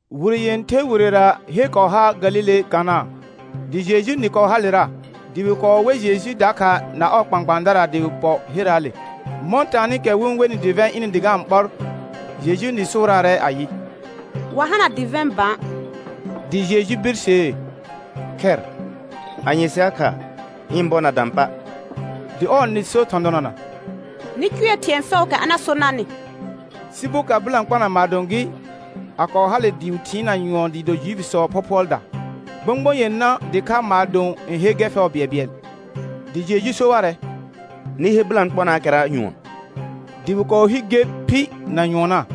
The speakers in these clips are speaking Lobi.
Wire yẽther wirera her kɔɔ har Galile Kana, dɩ Jejuu nɩ kɔɔ halera. Dɩ wɩ kɔɔ wer Jeju dakha na ɔɔ kpãkpãadara dɩ wɩ pɔ herraale. Mɔ̃ taanɩkɛ wɩ-n wenɩ dɩvɛ̃ ɩnɩ dɩ ga-n ɓɔr, Jejun nɩ sʋʋraarɛ ayɩ: Wa hana dɩvɛ̃ bã. Dɩ Jeju birsee: Khɛr, anye sɩ ha kha? Ɩ̃ bɔ na dã pa'. Dɩ ɔɔ nɩ so thɔ̃ donana: Nɩ cʋɛ thɩ̃ɛ fɛʋʋkɛ a na so narnɩ. Sɩ boka bɩlãkpona maadõ gɩ, a kɔɔ hale dɩ wɩ thɩɩnna nyʋɔn dɩɩ do Juifisɔɔ phɔphʋɔlda. Gbõgbõ yenã dɩkha maadõ n he gɛr fɛʋ bɩɛlbɩɛl. Dɩ Jeju so warɛ: Nɩ he bɩlãkponaakɛra nyʋɔn. Dɩ wɩ kɔɔ hi ger phi na nyʋɔnna.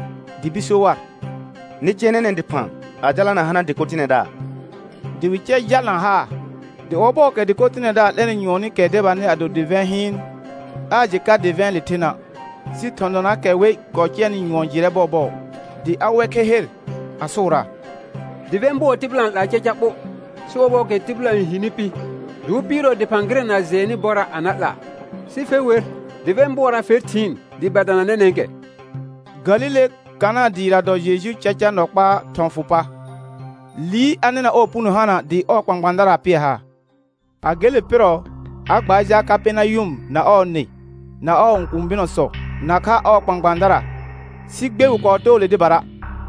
Dɩ bir so war: Nɩ cɛ nɛnɛ̃ dɩphã a jalana hana dɩko tɩnɛdaar; dɩ wɩ cɛ jalna haa. Dɩ ɔbɔɔkɛ dɩko tɩnɛdaar 'lɛnɩ nyʋɔnɩkɛ debanɩ a do dɩvɛ̃ hɩɩn, aa jɩ ka dɩvɛ̃ɛle thena'; sɩ thɔ̃ donaakɛ wer kɔɔ cɛnɩ nyʋɔn jɩrɛ bɔɔbɔɔ; dɩ a wer kher he, a sʋʋraa: Dɩvɛ̃ bʋɔ tɩbɩla fɛʋ n 'laa caca ɓo, sɩ ɔbɔɔkɛ tɩbɩla n hini pɩ, dɩ wɩ pɩɩrɔ dɩphã gɩrɛ na jɩɛnnɩ bɔra' a na 'laa, sɩ fe wer dɩvɛ̃ bʋɔra fer thɩɩn dɩɩ ba dana nɛnɛ̃kɛ. Galile Kana dɩɩra dɔ Jejuu caca nɔ kpaa thɔ̃ fʋ pa. Liir a nɩna ɔɔ puno hana dɩ ɔɔ kpãkpãadara pɩɛ haar. A gele pɩrɔ, a gbaar jal Kapɛrnayʋm na ɔɔ nɩ, na ɔɔ õkũu bɩnɔsɔ, nakha ɔɔ kpãkpãadara, sɩ gbe wɩ kɔɔ too le dɩbara.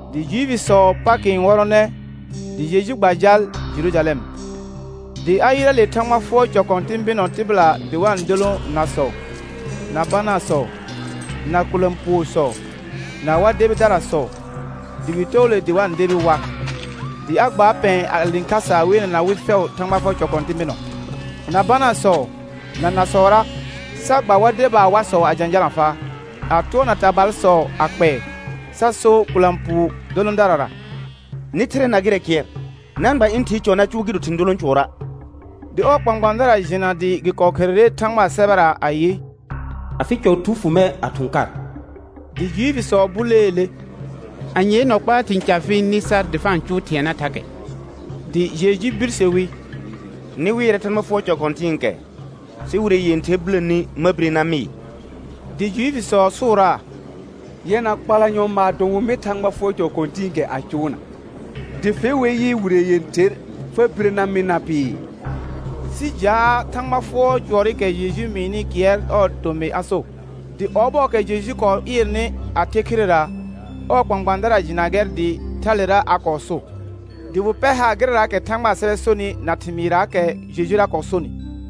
Dɩ Juifisɔɔ Pakɩ n wɔrɔnɛ, dɩ Jeju gba jal Jerujalɛm. Dɩ a yɩrɛ le Thãgba fʋɔr cɔ kɔ̃tɩ̃ bɩnɔ tɩbɩla dɩ wa-n dolõ nasɔ, na banaasɔ, na kʋlã puosɔ, na war debidarasɔ, dɩ wɩ too dɩ wa-n debi war. Dɩ a gbaar pɛ̃ɛ a le khasa a weelena wɩ fɛʋ Thãgba fʋɔr cɔ kɔ̃tɩ̃ bɩnɔ, na banaasɔ, na nasɔra, sa gba war debaa warsɔ a jãjalã a faa, a tʋɔrna tabalsɔ a kpɛɛ, sa so kʋlã puu dolõdarara: Nɩ thɩrɛ na gɩrɛ kɩɛr. Na-n gba ɩ̃ Thɩɩ cɔ na cʋʋ gɩ do thɩ̃ dolõ cʋɔra'. Dɩ ɔɔ kpãkpãadara jɩna dɩ gɩ kɔɔ kherere Thãgbaa sɛbɛra ayɩ: «Afɩ cɔ thu fʋ mɛr a thʋ̃ kar.» Dɩ Juifisɔ buleele: Anyee nɔ kpaa thɩ̃ ca fɩ-n nɩ sar dɩ fa-n cʋʋ thɩɛna thakɛ? Dɩ Jeju birse wi: Nɩ wɩɛrɛ Thãgba fʋɔr cɔ kɔ̃tɩ̃ɩkɛ, sɩ wire yẽther biləni ma bire na mɩɩ. Dɩ Juifisɔ sʋʋraa: Yɛna kpalanyɔ maadõ wɩ mɩ Thãgba fʋɔr cɔ kɔ̃tɩ̃ɩkɛ a cʋʋna, dɩ fe wer yɩ, wire yẽther fa bire na mɩ na pɩɩ? Sɩ jaa Thãgba fʋɔr cʋɔrɩkɛ Jeju mɩɩnɩ kɩɛr ɔɔ tomɩ a so. Dɩ ɔbɔɔkɛ Jeju kɔɔ ɩɩrnɩ a the khirera, ɔɔ kpãkpãadara jɩna gɛr dɩ thalera a kɔɔ so, dɩ wɩ pɛr haar gɩrɛraakɛ Thãgbaa sɛbɛ sonɩ na thɩmɩɩrraakɛ Jejura kɔɔ sonɩ.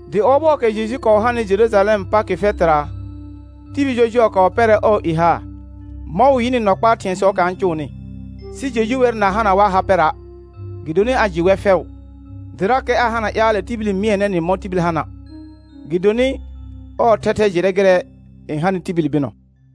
Dɩ ɔbɔɔkɛ Jeju kɔɔ hanɩ Jerujalɛm Pakɩ fɛtɩra, tibil jɔjʋɔ kɔɔ pɛrɛ ɔɔ i haar, mɔ̃ wɩ yɩnɩ nɔ kpaa thɩ̃ɛsɔɔkɛ a-n cʋʋnɩ. Sɩ Jeju wer na hana war ha pɛra', gɩdonɩ a jɩ wɛr fɛʋ, dɩrakɛ aa hana ƴaalɛ tibil n mɩɛnɛ nɩ mɔ̃ tibil hana', gɩdcmɩ ɔr thɛthɛ jɩrɛ gɩrɛ n hanɩ tibili bɩnɔ.